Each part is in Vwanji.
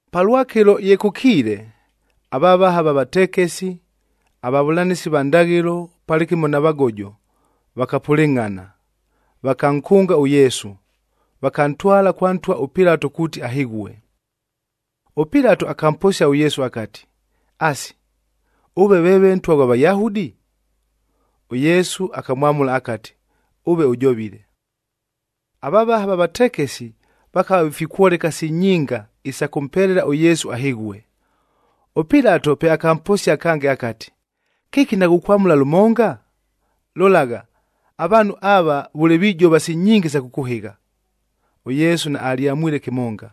Palwakɨlo ye kʉkiile, avavaha va vatekesi, avavʉlanɨsi va ndaghɨlo palɨkɨmo na vagojo, vakapʉlɨngʼhana. Vakankʉnga ʉYesu, vakantwala kwa ntwa ʉPilatoa kuuti ahɨghue. ɄPilato akamposia ʉYesu akati, “Asi, ʉve veeve Ntwa ghwa Vayahudi?” ɄYesu akamwamʉla akati, “Ʉve ʉjovile.” Avavaha va vatekesi vakava vifikwoleka si nyinga isa kʉmpelela ʉYesu ahɨghue. ɄPilato pe akamposia kange akati, “Kɨki naghukwamʉla lʉmonga? Lolagha, avaanhu ava vʉle vijova si nyinga isa kʉkʉhɨgha.” ɄYesu naalyamwile kɨmonga.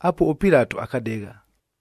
Apuo ʉPilato akadegha.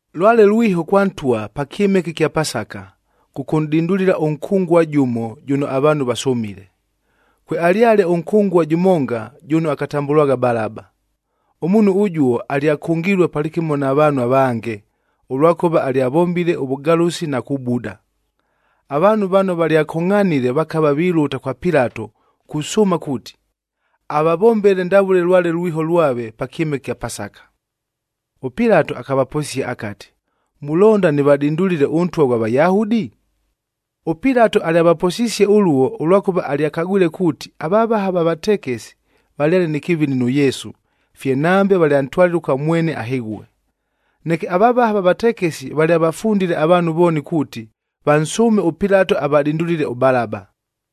Lwale lwiho kwa ntwa pa kyɨmɨke ɨkya Pasaka, kʉkʉnʼdindulila ʉnkʉngua jʉmo jʉno avaanhu vasʉmile. Kwealyale ʉnkʉngua jʉmonga jʉno akatambʉlwagha Balaba. Ʉmuunhu ʉjuo alyakʉngilue palɨkɨmo na vaanhu avange, ʉlwakʉva valyavombile ʉvʉgalʉsi na kubuda. Avaanhu vano valyakongʼhanile vakava vilʉta kwa Pilato kusʉʉma kuuti, avavombele ndavʉle lwale lwiho lwake pa kyɨmɨke ɨkya Pasaka. ɄPilato akavaposia akati, “Mulonda nɨvadindulile ʉNtwa ghwa Vayahudi?” ɄPilato alyavaposisie ʉluo, ʉlwakʉva alyakagwile kuuti, avavaha va vatekesi valyale nɨ kɨvini nʉ Yesu, fye nambe valyantwalile kwa mwene ahɨghue. Neke avavaha va vatekesi valyavafundile avaanhu vooni kuuti, vansʉʉme ʉPilato avadindulile ʉBalaba.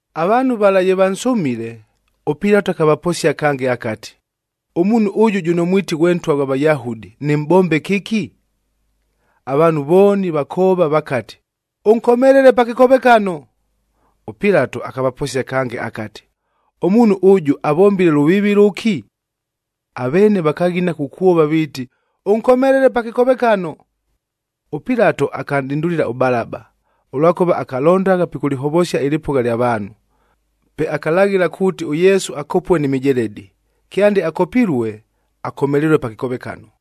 Avaanhu vala ye vansʉmile, ʉPilato akavaposia kange akati, “Ʉmuunhu ʉjʉ jʉno mwiti ghwe Ntwa ghwa Vayahudi, nɨmʼbombe kɨki?” Avaanhu vooni vakoova vakati, “Ʉnkomelele pa kɨkovekano!” ɄPilato akavaposia kange akati, “Ʉmuunhu ʉjʉ avombile lʉviivi lʉki?” Aveene vakaghina kukwova viiti, “Ʉnkomelele pa kɨkovekano!” ɄPilato akanʼdindulila ʉBalaba, ʉlwakʉva akalondagha pikʉlɨhovosia ɨlɨpʉgha lya vaanhu. Pe akalaghɨla kuuti ʉYesu akopue ni mijeledi, kyande akopilue, akomelelue pa kɨkovekano.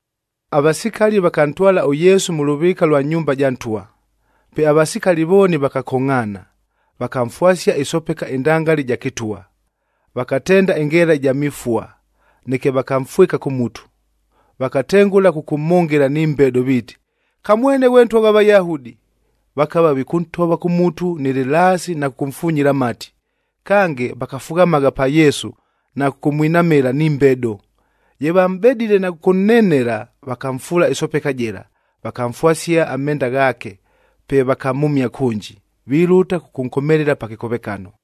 Avasikali vakantwala ʉYesu mʉ lʉvɨɨka lwa nyumba ja ntwa, pe avasikali vooni vakakongʼhaana. Vakamfwasia ɨsopeka ɨndangali ɨja kɨtwa, vakatenda ɨngeela ɨja mifua, neke vakamfwɨka kʉ mutu. Vakatengʉla kʉkʉmhʉngɨla ni mbedo viiti, “Kamwene ghwe Ntwa ghwa Vayahudi!” Vakava vikʉntova kʉ mutu nɨ lɨlaasi na kʉkʉmfunyila amati. Kange, vakafughamagha pa Yesu na kʉkʉmwinamɨla ni mbedo. Ye vamʼbedile na kʉkʉnnenela, vakamfuula ɨsopeka jɨla, vakamfwasia amenda ghaake, pe vakamhʉmia kʉnji, vilʉta kʉkʉnkomelela pa kɨkovekano.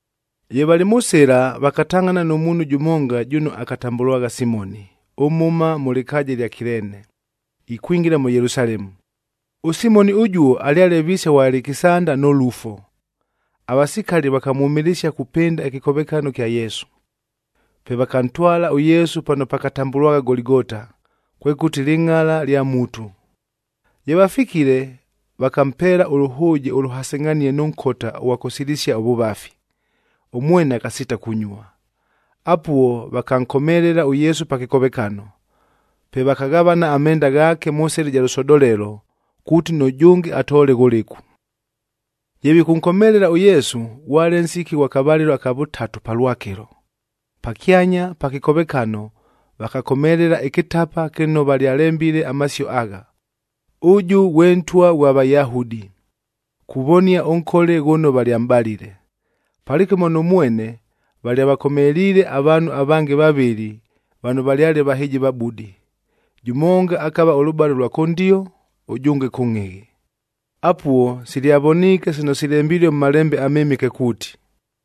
Ye valɨ mʉ sɨla, vakatangʼhana nʉ muunhu jʉmonga jʉno akatambʉlwagha Simoni, ʉmhʉma mʉ lɨkaaja ɨlya Kileene, ikwingila mʉ Yelusalemu. ɄSimoni ʉjuo alyale viise ghwa Alekisanda nʉ Lufo. Avasikali vakamwʉmɨlɨsia kupɨnda ɨkɨkovekano kya Yesu. Pe vakantwala ʉYesu pano pakatambʉlwagha Goligota, kwekʉti, Lɨngʼala lya Mutu. Ye vafikile, vakampeela ʉlʉhʉʉje ʉlʉhasɨngʼhanie nʉ nkota ʉghwa kʉsilisia ʉvʉvafi, ʉmwene akasiita kunyua. Apuo vakankomelela ʉYesu pa kɨkovekano. Pe vakaghavana amenda ghaake mʉ sɨla ja lʉsodolelo, kuuti nʉjʉnge atoole ghʉlɨku. Ye vikʉnkomelela ʉYesu, ghwale nsiki ghwa kavalɨlo kya vʉtatu palwakɨlo. Pakyanya pa kɨkovekano vakakomelela ɨkɨtapa kɨno valyalembile amasio agha, “ɄJɄ GHWE NTWA GHWA VAYAHUDI,” kuvonia ʉnkole ghʉno valyamʼbalile. Palɨkɨmo nʉ mwene, valyavakomeliile avaanhu avange vavɨlɨ vano valyale vahɨjivabudi, jʉmonga akava ʉlʉbale ʉlwa kʉndio, ʉjʉnge kʉngʼhɨghɨ. Apuo silyavoniike sino silembilue mʉ Malembe aMɨmɨke kuuti,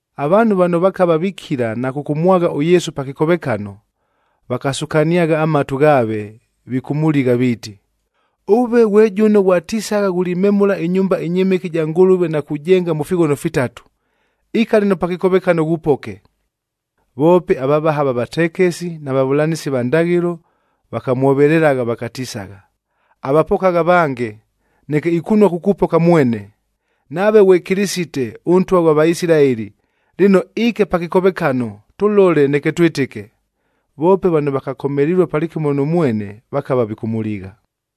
Avaanhu vano vakava vikila na kʉkʉmwagha ʉYesu pa kɨkovekano, vakasukaniagha amatu ghaave vikʉmʉligha, viiti, “Ʉve ghwe jʉno ghwatisagha ghulimemʉla ɨnyumba ɨnyɨmɨke ɨja Ngʉlʉve na kujenga mʉ fighono fitatu, ika lɨno pa kɨkovekano ghupoke!” Voope avavaha va vatekesi na vavʉlanɨsi va ndaghɨlo vakamwovelelagha vakatisagha, “Avapokagha avange, neke ikunua kukupoka mwene! Nave ghwe Kɨlɨsite, ʉNtwa ghwa Vaisilaeli, lɨno iike pa kɨkovekano, tʉlole neke twɨtɨke.” Voope vano vakakomelilue palɨkɨmo nʉ mwene vakava vikʉmʉligha.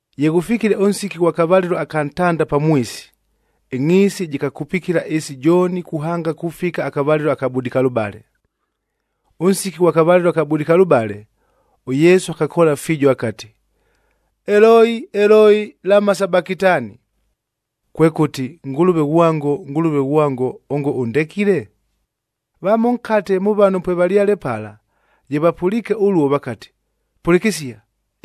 Ye ghʉfikile ʉnsiki ghwa kavalɨlo aka ntanda pamwisi, ɨngʼhiisi jɨkakupikila ɨɨsi jooni kuhanga kufika akavalɨlo aka budikalʉbale. Ʉnsiki ghwa kavalɨlo aka budikalʉbale, ʉYesu akakoola fiijo akati, “Eloi, Eloi, lama sabakitani?” Kwekʉti, “Ngʉlʉve ghwango, Ngʉlʉve ghwango, Vamo nkate mʉ vano pwevalyale pala, ye vapʉliike ʉluo, vakati, “Pʉlɨkɨsia!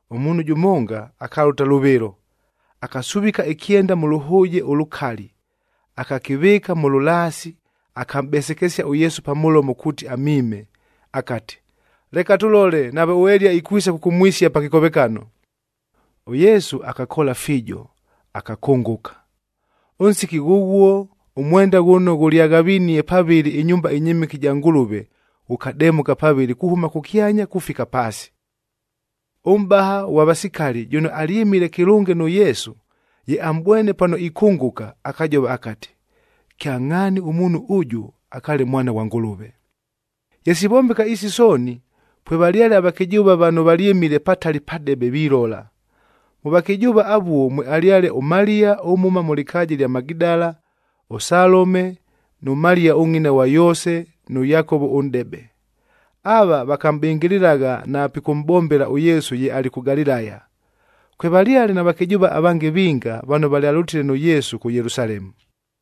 Ʉmuunhu jʉmonga akalʉta lʉvɨlo, akasuvika ɨkyenda mʉ lʉhʉʉje ʉlʉkali, akakɨvɨɨka mʉ lʉlaasi, akamʼbesekesia ʉYesu pa mʉlomo kuuti amiime, akati, “Leka tʉlole, nave ʉEliya ikwisa kʉkʉmwisia pa kɨkovekano!” ɄYesu akakoola fiijo, akakʉngʉka. Ʉnsiki ghʉghuo ʉmwendaf ghʉno ghʉlyaghavinie pavɨlɨ ɨnyumba ɨnyɨmɨke ɨja Ngʉlʉve, ghʉkademʉka pavɨlɨ kuhʉma kʉkyanya kufika paasi. Ʉmʼbaha ʉghwa vasikali jʉno alyɨmile kɨlʉnge nʉ Yesu, ye amʼbwene pano ikʉngʉka, akajova akati, “Kyangʼhaani ʉmuunhu ʉjʉ akaale Mwana ghwa Ngʉlʉve!” Ye sivombeka isi sooni, pwevalyale avakɨjʉʉva vano valyɨmile patali padebe vilola. Mʉ vakɨjʉʉva avuo mwealyale ʉMaliya ʉmhʉma mʉ lɨkaaja ɨlya Magidala, ʉSalome nʉ Maliya ʉngʼina ghwa Yoose nʉ Yakovo ʉnʼdebe. Ava vakamʼbɨngɨlɨlagha na pikʉmʼbombela ʉYesu ye alɨ kʉ Galilaya. Kwevalyale na vakɨjʉʉva avange vinga vano valyalʉtile nʉ Yesu kʉ Yelusalemu.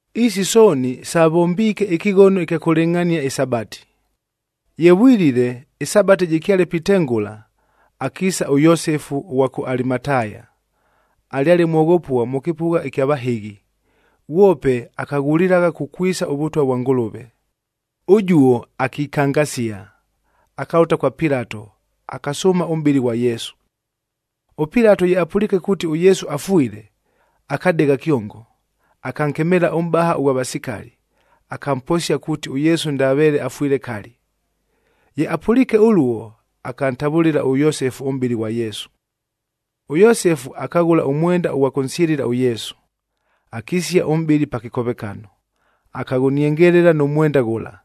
Isi sooni savombiike ɨkɨghono ɨkya kʉlɨngʼhania ɨSabati.g Ye vwilile, ɨSabati jɨkyale pitengʉla, akiisa ʉYosefu ʉghwa kʉ Alimataya, alyale mwoghopua mʉ kɨpʉgha ɨkya vahɨghi. Ghwope akaghulilagha kukwisa ʉVʉtwa vwa Ngʉlʉve. Ʉjuo akikangasia, akalʉta kwa Pilato, akasʉʉma ʉmʼbɨlɨ ghwa Yesu. ɄPilato ye apʉliike kuuti ʉYesu afwile, akadegha kyongo. Akankemeela ʉmʼbaha ʉghwa vasikali, akamposia kuuti ʉYesu ndaveele afwile kali. Ye apʉliike ʉluo, akantavʉlɨla ʉYosefu ʉmʼbɨlɨ ghwa Yesu. ɄYosefu akaghʉla ʉmwenda ʉghwa kʉnsyɨlɨla ʉYesu. Akisia ʉmʼbɨlɨ pa kɨkovekano, akaghʉniengelela nʉ mwenda ghʉla.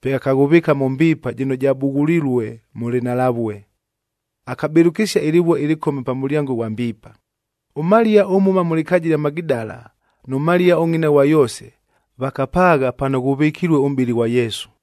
Pe akaghʉvɨɨka mʉ mbiipa jɨno jabughulilue mʉ lɨnhalavue, akabɨlʉkɨsia ɨlɨvue ɨlɨkome pa mʉlyango ghwa mbiipa. ɄMaliya ʉmhʉma mʉ lɨkaaja ɨlya Magidala nʉ Maliya ʉngʼina ghwa Yoose, vakapaagha pano ghʉvɨkilue ʉmʼbɨlɨ ghwa Yesu.